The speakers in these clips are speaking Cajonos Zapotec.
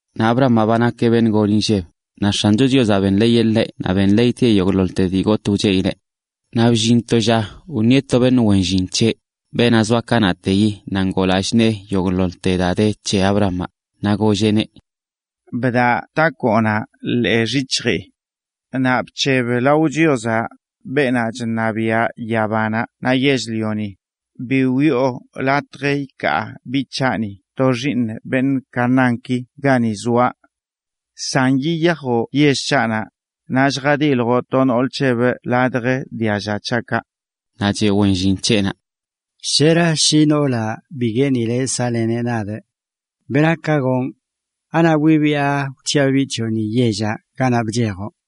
Naꞌ Abrahamaꞌ ba nakeꞌ beṉꞌ gol inlleb, naꞌ X̱ancho Chiozaꞌ benḻeeyeꞌ ḻeꞌ naꞌ benḻeeytieꞌ yogꞌḻoḻte dii gotꞌ wcheꞌileꞌ. Naꞌ bllin to lla wṉieꞌ to beṉꞌ wen llin c̱heꞌ, beenaꞌ zoa kanaꞌteyi naꞌ ngoo lallꞌ nee yogꞌḻoḻte daa de c̱he Abrahamaꞌ, naꞌ golleꞌneꞌ: ―Bdaꞌ takoonaꞌ ḻee xyic̱hjii, naꞌ bc̱heb lao Chiozaꞌ, beenaꞌ chṉabiꞌa yabanaꞌ naꞌ yell-lioni, bi wiꞌo latj ikaa biꞌ c̱haꞌni to xiiṉ beṉꞌ Canaánki gani zoaꞌ. San yiyajoꞌ yell c̱haꞌnaꞌ, naꞌ lljadiḻjoꞌ to nool c̱hebꞌ ladj dialla c̱haꞌkaꞌ. Naꞌ cheꞌ wen llin c̱heꞌnaꞌ: ―Shera shi noolaꞌ bi gueenileꞌ saꞌleneꞌ nadꞌ. ¿Bera ka gonꞌ? ¿Anaꞌ wibiꞌa wc̱hiꞌa biꞌ c̱hoꞌni yellaꞌ ganaꞌ bchejoꞌ?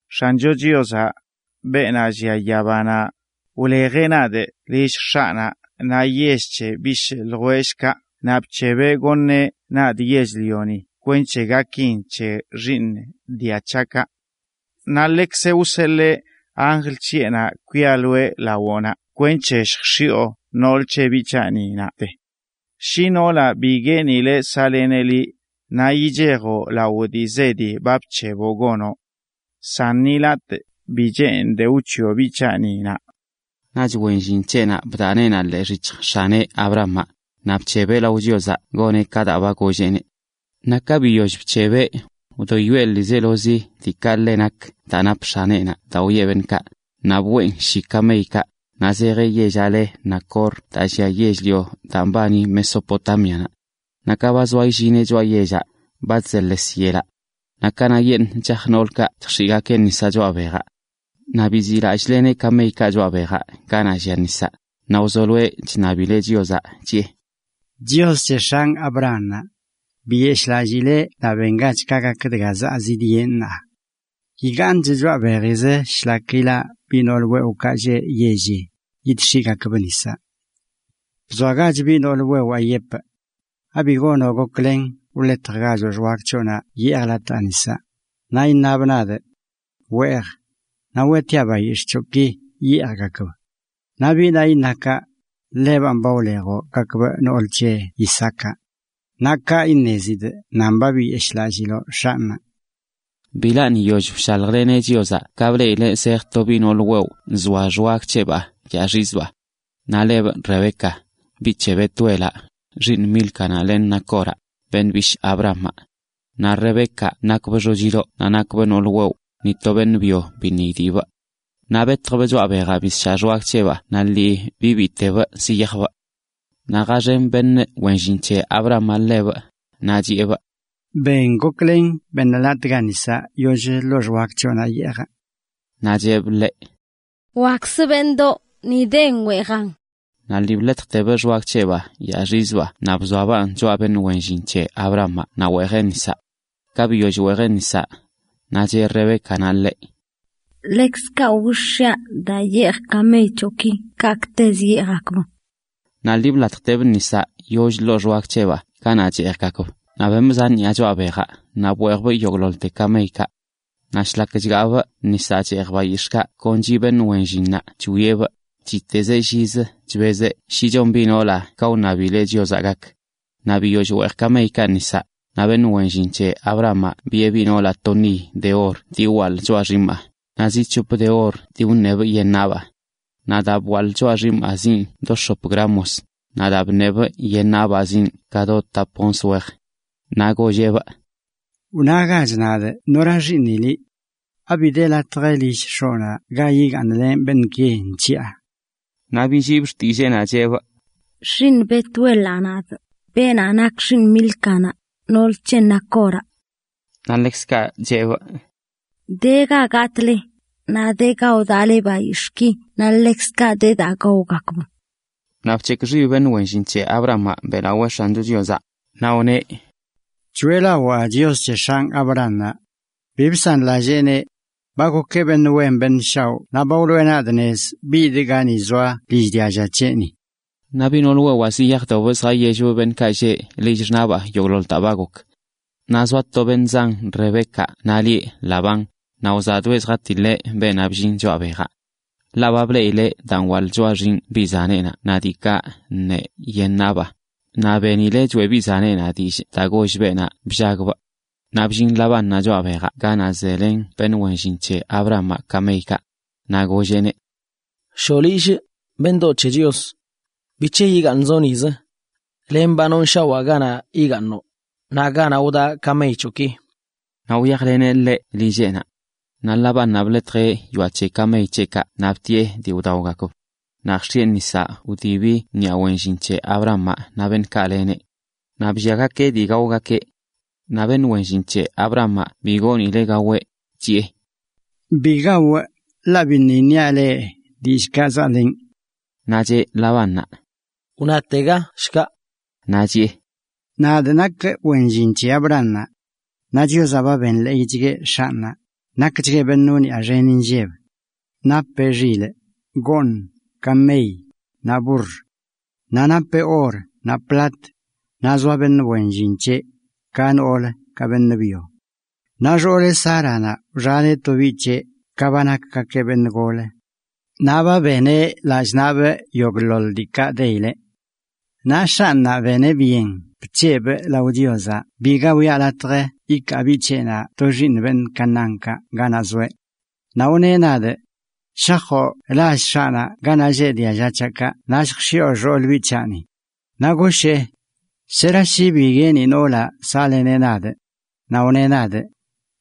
X̱ancho Chiozaꞌ, beenaꞌ llia yabanaꞌ, wlejeꞌ nadꞌ lill x̱aꞌnaꞌ naꞌ yell c̱he bishꞌ ljwellꞌkaꞌ naꞌ bc̱hebeꞌ goṉeꞌ nadꞌ yell-lioni kwenc̱he gakin c̱he xiiṉ dia c̱haꞌkaꞌ. Naꞌ ḻekzeꞌ wseḻee anjl c̱heꞌnaꞌ kwialoeꞌ lawoꞌnaꞌ kwenc̱he lljx̱ioꞌ nool c̱he biꞌ c̱haꞌni naꞌte. Shi noolaꞌ bi gueenileꞌ saꞌleneꞌ liꞌ, naꞌ ichejoꞌ lao dii zedi ba bc̱heboꞌ gonoꞌ. San ni latꞌ bi cheenidꞌ wc̱hiꞌo biꞌ c̱haꞌni naꞌ. Naꞌch wen llin c̱heꞌnaꞌ bdaꞌ neenaꞌ ḻee xyic̱hj x̱aneꞌ, Abrahamaꞌ, naꞌ bc̱hebeꞌ lao Chiozaꞌ goneꞌ ka daa ba golleꞌneꞌ. Naꞌ ka biyoll bc̱hebeꞌ, wdoyoeꞌ ḻiizelozi diikaꞌ ḻe nak daa nap x̱aneꞌnaꞌ daa wiꞌe beṉꞌkaꞌ, naꞌ bween shi kameykaꞌ, naꞌ zejeꞌ yellaꞌ le Nacor daa llia yell-lio daa mbani Mesopotámianaꞌ. Naꞌ ka ba zoa illineꞌ choꞌa yellaꞌ, ba chzeḻes yelaꞌ. Naꞌ kanaꞌyeṉꞌ chaj noolkaꞌ chjx̱iꞌgakeꞌ nisaꞌ choꞌa bejaꞌ. Naꞌ biziꞌlallꞌleneꞌ kameykaꞌ choꞌa bejaꞌ ganaꞌ llia nisaꞌ, Naꞌ wzoloeꞌ chṉabileꞌ Chiozaꞌ, chiꞌe: “Chios c̱he x̱anꞌ Abrahamaꞌ, biyeshꞌlallii ḻeꞌ naꞌ bengach ka gak dga zaa zidyenꞌ ṉaa. Yigaaṉchꞌ choꞌa bejizə shlak ilaꞌ biꞌ nool wewꞌkaꞌ lleꞌ yelli, yidx̱iꞌgakbꞌ nisaꞌ. Bzoagach biꞌ nool wewaa yepꞌ: Abi gonoꞌ goklen wḻetjgachoꞌ xwag c̱hoꞌnaꞌ yeejꞌ latꞌ nisaꞌ, naꞌ iṉabꞌ nadꞌ: Weej, naꞌ weꞌtiaꞌ bayix̱ꞌ c̱hoꞌki yeejgakb. Naꞌ biꞌnaꞌ iṉa kaꞌ, ḻebanꞌ ba wlejoꞌ gakbꞌ nool c̱he Isaacaꞌ. Naꞌ kaꞌ iṉezidꞌ nan ba biyeshꞌlalliloꞌ x̱anꞌnaꞌ.” Bilaṉꞌ yiyoll wshaljleneꞌ Chiozaꞌ ka bleꞌileꞌ zej to biꞌ noolə wewꞌ nzoa xwag c̱heꞌbaa yaaxizbaa. Naꞌ lebꞌ Rebeca, biꞌ c̱he Betuelaꞌ, xiiṉ Mílcanaꞌ len Nacoraꞌ, beṉꞌ bishꞌ Abrahamaꞌ. Naꞌ Rebeca nakbꞌ xochidoꞌ naꞌ nakbꞌ nool wewꞌ, ni to beṉꞌ byo biṉꞌ idiꞌbꞌ. Naꞌ betjbꞌ choꞌa bejaꞌ bisshaꞌ xwag c̱heꞌbaa naꞌ lii bibiitebꞌ ziyajbꞌ. Naꞌ jaxen beṉꞌ wen llin c̱he Abrahamaꞌ ḻebꞌ, naꞌ chiꞌebꞌ: ―Ben goklen beṉ latꞌga nisaꞌ yoll ḻoo xwag c̱hoꞌnaꞌ yeejꞌ. Naꞌ cheꞌb ḻeꞌ: ―Wakzzə, beṉꞌdoꞌ, ni den, weejan. Naꞌ lii bḻetjtebꞌ xwag c̱heꞌbaa yaaxizbaa naꞌ bzoabaꞌn choꞌa beṉꞌ wen llin c̱he Abrahamaꞌ naꞌ weejeꞌ nisaꞌ. Ka biyoll weejeꞌ nisaꞌ, naꞌ cheꞌ Rebécanaꞌ ḻeꞌ: ―Ḻekzkaꞌ willjx̱iaꞌ daa yeej kamey c̱hoꞌki kaꞌkꞌtezə yeejgakb. Naꞌ lii blatjtebꞌ nisaꞌ yollə ḻoo xwag c̱heꞌbaa ganaꞌ cheejgakb naꞌ bemꞌ zan ṉiꞌa choꞌa bejaꞌ naꞌ bweejbꞌ yogꞌḻoḻte kameykaꞌ. Naꞌ shlak chgaabꞌ nisaꞌ cheej bayix̱ꞌkaꞌ kon chiꞌ beṉꞌ wen llinnaꞌ chwieꞌbꞌ, chiꞌtezeꞌ llizə chbezeꞌ shi chon biꞌ noolaꞌ ka wṉabileꞌ Chiozaꞌ gak. Naꞌ biyoll weej kameykaꞌ nisaꞌ, naꞌ beṉꞌ wen llin c̱he Abrahamaꞌ biꞌe biꞌ noolaꞌ to niy de or [dii wwaḻꞌ dii bwaḻee] choꞌa xiimaꞌ, naꞌ zi c̱hop de or dii wṉebꞌ[dii bṉiꞌe] yen nabaa. Naꞌ daa bwaḻꞌ[bwaḻee] xiimaa ziin do x̱op gramos, naꞌ daꞌ bṉebꞌ[bṉiꞌe] yen nabaa ziin ka do tap gayꞌ onz wej. Naꞌ golleꞌbꞌ: ―Wnagach nadꞌ nora xiiṉi liꞌ.() ¿Abi de latj lill x̱oꞌnaꞌ ga yigaaṉlenꞌ beṉꞌki nc̱hiꞌa? Naꞌ billiibꞌ xtilleenaꞌ, cheꞌbꞌ: ―Xiiṉ Betuelaꞌ nadꞌ, beenaꞌ nak xiiṉ Mílcanaꞌ, nool c̱he Nacoraꞌ. Naꞌ lillntoꞌ de ga gatꞌle, naꞌ de ga wdaꞌle bayix̱ꞌki naꞌ ḻekzkaꞌ de daa gaogakb. Naꞌ bc̱hekꞌ xib beṉꞌ wen llin c̱he Abrahamaꞌ beꞌlawee X̱ancho Chiozaꞌ, naꞌ wneꞌ: “Choeꞌlawaa Chios c̱he x̱anꞌ Abrahamaꞌ. Bi bsanlalleeneꞌ. Ba gokeꞌ beṉꞌ wen beṉꞌ shaoꞌ naꞌ ba wloꞌe nadꞌ nez bidꞌ gani zoa lill dialla c̱heꞌni.” Naꞌ biꞌ nool wewaa ziyajdobꞌ zjayellbꞌ beṉꞌkaꞌ lleꞌ lill xṉaꞌbaa yogꞌḻoḻ daa ba gok. Naꞌ zoa to beṉꞌ zan Rebécanaꞌ lieꞌ Labán, naꞌ wzaꞌdoeꞌ zjatiḻeꞌ beenaꞌ bllin choꞌa bejaꞌ. Ḻaꞌ ba bleꞌileꞌ daa nwaḻꞌ choꞌa xinꞌ biꞌ zaneꞌnaꞌ naꞌ diikaꞌ ṉee yen nabꞌ, naꞌ benileꞌ choeꞌ biꞌ zaneꞌnaꞌ dillꞌ daa goll beenaꞌ bllagbꞌ. Naꞌ bllin Labánnaꞌ choꞌa bejaꞌ ganaꞌ zelen beṉꞌ wen llin c̱he Abrahamaꞌ kameykaꞌ. Naꞌ golleꞌneꞌ: ―Shoꞌ lillꞌ, beṉꞌdoꞌ c̱he Chios. ¿Bic̱he yigaaṉzoꞌ nizə? Ḻaꞌ ba nonshawaa ganaꞌ yigaaṉoꞌ, naꞌ ganaꞌ wdaꞌ kamey c̱hoꞌki. Naꞌ wyajleneꞌneꞌ lilleꞌnaꞌ. Naꞌ Labánnaꞌ bḻetjeꞌ yoaꞌ c̱he kamey c̱heꞌkaꞌ naꞌ btiꞌe dii wdaogakb. Naꞌ jx̱iꞌe nisaꞌ wdibi ṉiꞌa wen llin c̱he Abrahamaꞌ naꞌ beṉꞌkaꞌ leneꞌ. Naꞌ ka blliagakeꞌ dii gaogakeꞌ naꞌ beṉꞌ wen llin c̱he Abrahamaꞌ bi goonileꞌ gaweꞌ, chiꞌe: ―Bi gawꞌ, la biṉꞌ iṉiaꞌ leꞌ dillꞌkaꞌ zaꞌlenꞌ. Naꞌ cheꞌ Labánnaꞌ: ―Wnatega, shkaꞌ. Naꞌ chiꞌe: ―Nadꞌ nak wen llin c̱he Abrahamaꞌ. Naꞌ Chiozaꞌ ba benḻeeychgueꞌ x̱anꞌnaꞌ, nakchgueꞌ beṉꞌ wniꞌa xen inlleb: napeꞌ xilꞌ, bak, goṉꞌ, kamey, naꞌ burr. Naꞌ napeꞌ or naꞌ plat, naꞌ zoa beṉꞌ wen llin c̱heꞌ, ka noolə ka beṉꞌ byo. Naꞌ xooleꞌ, Sáranaꞌ, wxaneꞌ to biꞌ c̱heꞌ ka ba nakgakeꞌ beṉꞌ golə. Naꞌ ba beneꞌ lallꞌ naꞌbꞌ yogꞌḻoḻ diikaꞌ deyileꞌ. Naꞌ x̱anꞌnaꞌ beneꞌ byen bc̱hebꞌ lao Chiozaꞌ biga wiꞌa latj yikaa biꞌ c̱heꞌnaꞌ to xiiṉ beṉꞌ Canaánkaꞌ ganaꞌ zoeꞌ. Naꞌ wneꞌ nadꞌ: “Shajoꞌ lall x̱aꞌnaꞌ ganaꞌ lleꞌ dialla c̱haꞌkaꞌ naꞌ lljx̱iꞌo xool biꞌ c̱haꞌni.” Naꞌ goshee: “¿Shera shi bi gueeni noolaꞌ saꞌleneꞌ nadꞌ?” Naꞌ wneꞌ nadꞌ: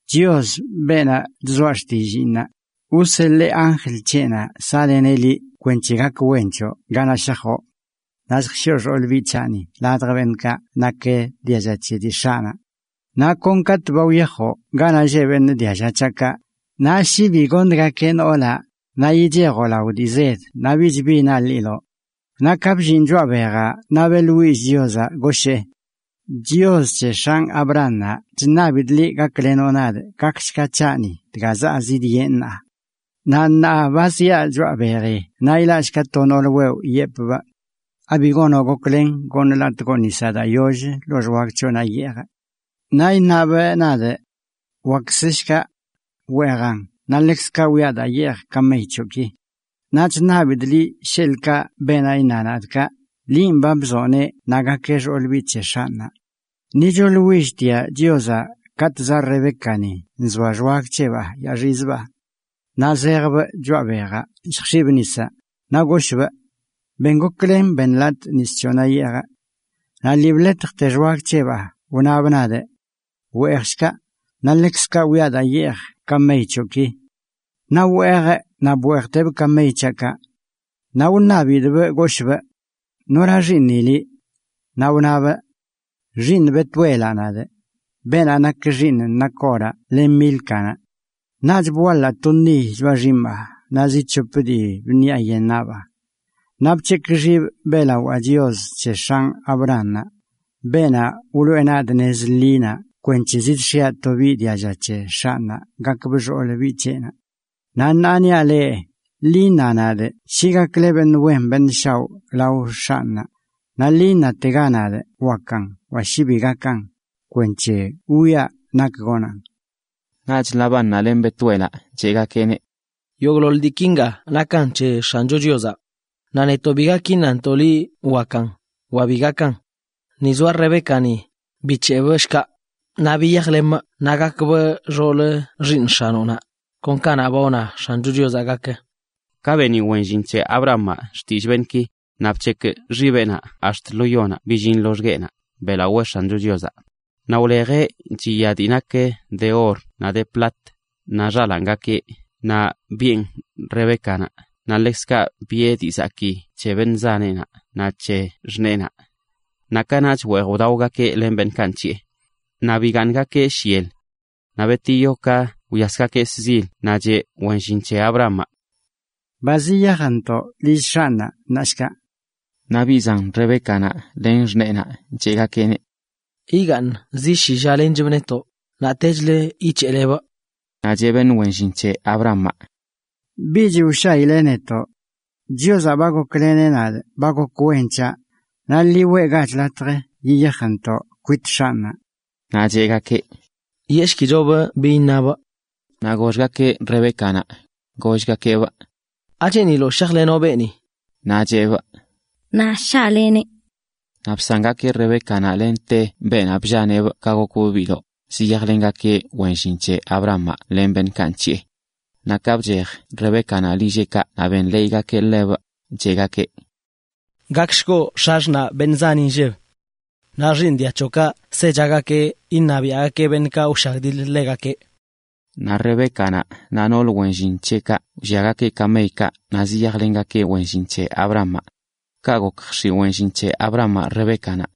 “Chios, beenaꞌ chzoa xtilliinnaꞌ, wseḻee anjl c̱heꞌnaꞌ saꞌleneꞌ liꞌ kwenc̱he gak wen c̱hoꞌ ganaꞌ shajoꞌ. Naꞌ lljx̱iꞌo xoolə biꞌ c̱haꞌni ladj beṉꞌkaꞌ nak dialla c̱he dii x̱aꞌnaꞌ. Naꞌ kon katꞌ ba wyajoꞌ ganaꞌ lleꞌ beṉꞌ dialla c̱haꞌkaꞌ, naꞌ shi bi goṉgakeꞌ noolaꞌ, naꞌ ichejoꞌ lao dii zed naꞌ bichbi naḻiloꞌ.” ’Naꞌ ka bllinꞌ choꞌa bejaꞌ naꞌ beꞌḻwillꞌ Chiozaꞌ, goshee: “Chios c̱he x̱anꞌ Abrahamaꞌ, chṉabidꞌ liꞌ gaklenoꞌ nadꞌ gakshga c̱haꞌni dga zaa zidyenꞌ ṉaa. Naꞌ ṉaa ba ziaꞌ choꞌa beji naꞌ ilaꞌshka to nool wewꞌ yepꞌbꞌ: ¿Abi gonoꞌ goklen goṉ latꞌgoꞌ nis daa yoll ḻoo xwag c̱hoꞌnaꞌ yeejꞌ? Naꞌ iṉabꞌ nadꞌ: Wakzə shkaꞌ. Weejan naꞌ ḻekzkaꞌ wiꞌa daa yeej kamey c̱hoꞌki. Naꞌ chṉabidꞌ liꞌ sheḻꞌkaꞌ beenaꞌ iṉa nadꞌ kaꞌ, linꞌ ba nzoꞌneꞌ naꞌ gakeꞌ xool biꞌ c̱he x̱anꞌnaꞌ.” Ni choeꞌḻwilltiaꞌ Chiozaꞌ katꞌ zaꞌ Rebécani nzoa xwag c̱heꞌbaa yaaxizbaa. Naꞌ zejbꞌ choꞌa bejaꞌ lljx̱iꞌbꞌ nisaꞌ, naꞌ goshꞌbꞌ: “Ben goklen, beṉ latꞌ nis c̱hoꞌnaꞌ yeejꞌ.” Naꞌ lii bḻetjte xwag c̱heꞌbaa wnabꞌ nadꞌ: ‘Weejshkaꞌ, naꞌ ḻekzkaꞌ wiꞌa daa yeej kamey c̱hoꞌki.’ Naꞌ weejꞌ naꞌ bweejtebꞌ kamey c̱haꞌkaꞌ. Naꞌ wṉabidꞌbꞌ, goshꞌbꞌ: “¿Nora xiiṉi liꞌ?” Naꞌ wnabꞌ: “Xiiṉ Betuelaꞌ nadꞌ, beenaꞌ nak xiiṉ Nacoraꞌ len Mílcanaꞌ.” Naꞌch bwaḻaa to niy choꞌa xiimaa naꞌ zi c̱hop dii bṉiaꞌ[bṉiꞌa] yen nabaa. Naꞌ bc̱hekꞌ xibꞌ beꞌlawaa Chios c̱he x̱anꞌ Abrahamaꞌ, beenaꞌ wloꞌe nadꞌ nez ḻinaꞌ kwenc̱he zidx̱iaꞌ to biꞌ dialla c̱he x̱anꞌnaꞌ gakbꞌ xool biꞌ c̱heꞌnaꞌ. Naꞌ ṉaa niaꞌ leꞌ, ḻi iṉa nadꞌ shi gakle beṉꞌ wen beṉꞌ shaoꞌ lao x̱anꞌnaꞌ, naꞌ lii iṉatega nadꞌ wakan wa shi bi gakan, kwenc̱he wwiaꞌ nak gonaꞌn. Naꞌch Labánnaꞌ len Betuelaꞌ cheꞌgakeꞌneꞌ: ―Yogꞌḻoḻ dii kinga nakan c̱he X̱ancho Chiozaꞌ. Naꞌ netoꞌ bi gak iṉantoꞌ liꞌ wakan, wa bi gakan. Ni zoa Rebécani, bic̱heꞌbꞌ shkaꞌ, naꞌ biyajlemꞌ naꞌ gakbꞌ xoolə xiiṉ x̱anoꞌnaꞌ, kon ka ba wna X̱ancho Chiozaꞌ gak. Ka beni wen llin c̱he Abrahamaꞌ xtillꞌ beṉꞌki, naꞌ bc̱hekꞌ xibeꞌnaꞌ ax̱t lo yonaꞌ billin loxgueꞌnaꞌ beꞌlawee X̱ancho Chiozaꞌ. Naꞌ wlejeꞌ chiya dii nak de or naꞌ de plat, naꞌ xalaangakeꞌ naꞌ biꞌen Rebécanaꞌ naꞌ ḻekzkaꞌ biꞌe dii zakii c̱he beṉꞌ zaneꞌnaꞌ naꞌ c̱he xṉeenaꞌ. Naꞌ kanaꞌch weej wdaogakeꞌ len beṉꞌkaꞌ nc̱hiꞌe. Naꞌ bigaaṉgakeꞌ shyel. Naꞌ betiyo ka wyasgakeꞌ shzil, naꞌ cheꞌ wen llin c̱he Abrahamaꞌ: ―Ba ziyajntoꞌ lill x̱anꞌnaꞌ ṉaa shkaꞌ. Naꞌ biꞌ zan Rebécanaꞌ len xṉeenaꞌ cheꞌgakeꞌ: ―Yigaaṉ zi shi lla lenchbꞌ netoꞌ, naꞌ techlə yic̱heꞌlebꞌ. Naꞌ cheꞌ beṉꞌ wen llin c̱he Abrahamaꞌ: ―Bich wshaile netoꞌ. Chiozaꞌ ba gokleneꞌ nadꞌ ba gok wen c̱haꞌ. Naꞌ ḻi weꞌgach latj yiyajntoꞌ kwit x̱anꞌnaꞌ. Naꞌ cheꞌgakeꞌ: ―Yeꞌshkichobꞌ bi iṉabꞌ. Naꞌ goxgakeꞌ Rebécanaꞌ, gollgakeꞌbꞌ: ―¿Acheeniloꞌ shajlenoꞌ beeni? Naꞌ cheꞌbꞌ: ―Naꞌ shaꞌleneꞌ. Naꞌ bsangakeꞌ Rebécanaꞌ lente beenaꞌ bllaneꞌbꞌ ka gokbꞌ biꞌdoꞌ, ziyajlengakeꞌ wen llin c̱he Abrahamaꞌ len beṉꞌkaꞌ nc̱hiꞌe. Naꞌ ka bchej Rebécanaꞌ lilleꞌkaꞌ naꞌ wṉabgakeꞌ gak wen c̱hebꞌ, cheꞌgakeꞌ: “Gakshkoꞌ x̱axṉaꞌ beṉꞌ zan inlleb. Naꞌ xiiṉ dia c̱hoꞌkaꞌ sechagakeꞌ iṉabiaꞌgakeꞌ beṉꞌkaꞌ wshagdiḻə ḻegakeꞌ.” Naꞌ Rebécanaꞌ naꞌ noolə wen llin c̱heꞌkaꞌ wlliagakeꞌ kameykaꞌ naꞌ ziyajlengakeꞌ wen llin c̱he Abrahamaꞌ. Ka gok jx̱iꞌ wen llin c̱he Abrahamaꞌ Rebécanaꞌ.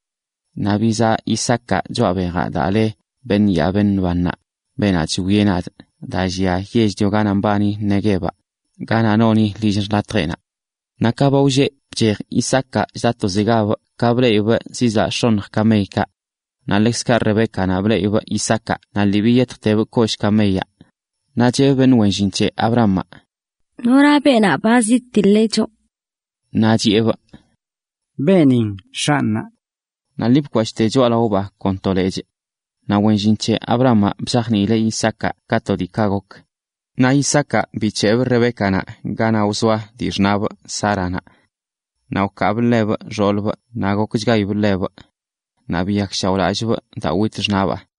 Naꞌ bizaa Isaacaꞌ choꞌa bejaꞌ daa le “Beṉꞌ yaa beṉꞌ bannaꞌ, beenaꞌ chwieꞌ nadꞌ”, a daa llia yell-lio ganaꞌ mbani Neguevaꞌ, ganaꞌ noni lill xlatjeꞌnaꞌ. Naꞌ ka ba wlleꞌ bchej Isaacaꞌ chda tozegabꞌ ka bleꞌibꞌ zizaꞌ x̱onj kameykaꞌ. Naꞌ ḻekzkaꞌ Rebécanaꞌ, bleꞌibꞌ Isaacaꞌ naꞌ lii biyetjtebꞌ kollꞌ kameyaꞌ, naꞌ cheꞌbꞌ beṉꞌ wen llin c̱he Abrahamaꞌ: ―¿Nora beenaꞌ ba zidtiḻeꞌ choꞌ? Naꞌch chiꞌebꞌ: ―Beenin x̱anꞌnaꞌ. Naꞌ lii bkwashꞌte choꞌalaobaa kon to lechꞌ. Naꞌ wen llin c̱he Abrahamaꞌ bzajniileꞌ Isaacaꞌ ka to diikaꞌ gok. Naꞌ Isaacaꞌ bic̱heꞌbꞌ Rebécanaꞌ ganaꞌ wzoa dii xṉabꞌ, Sáranaꞌ. Naꞌ wkaabꞌ ḻebꞌ xoolbꞌ naꞌ gokchgayibꞌ ḻebꞌ. Naꞌ biyakshaoꞌlallꞌbꞌ daa wit xṉaꞌbaa.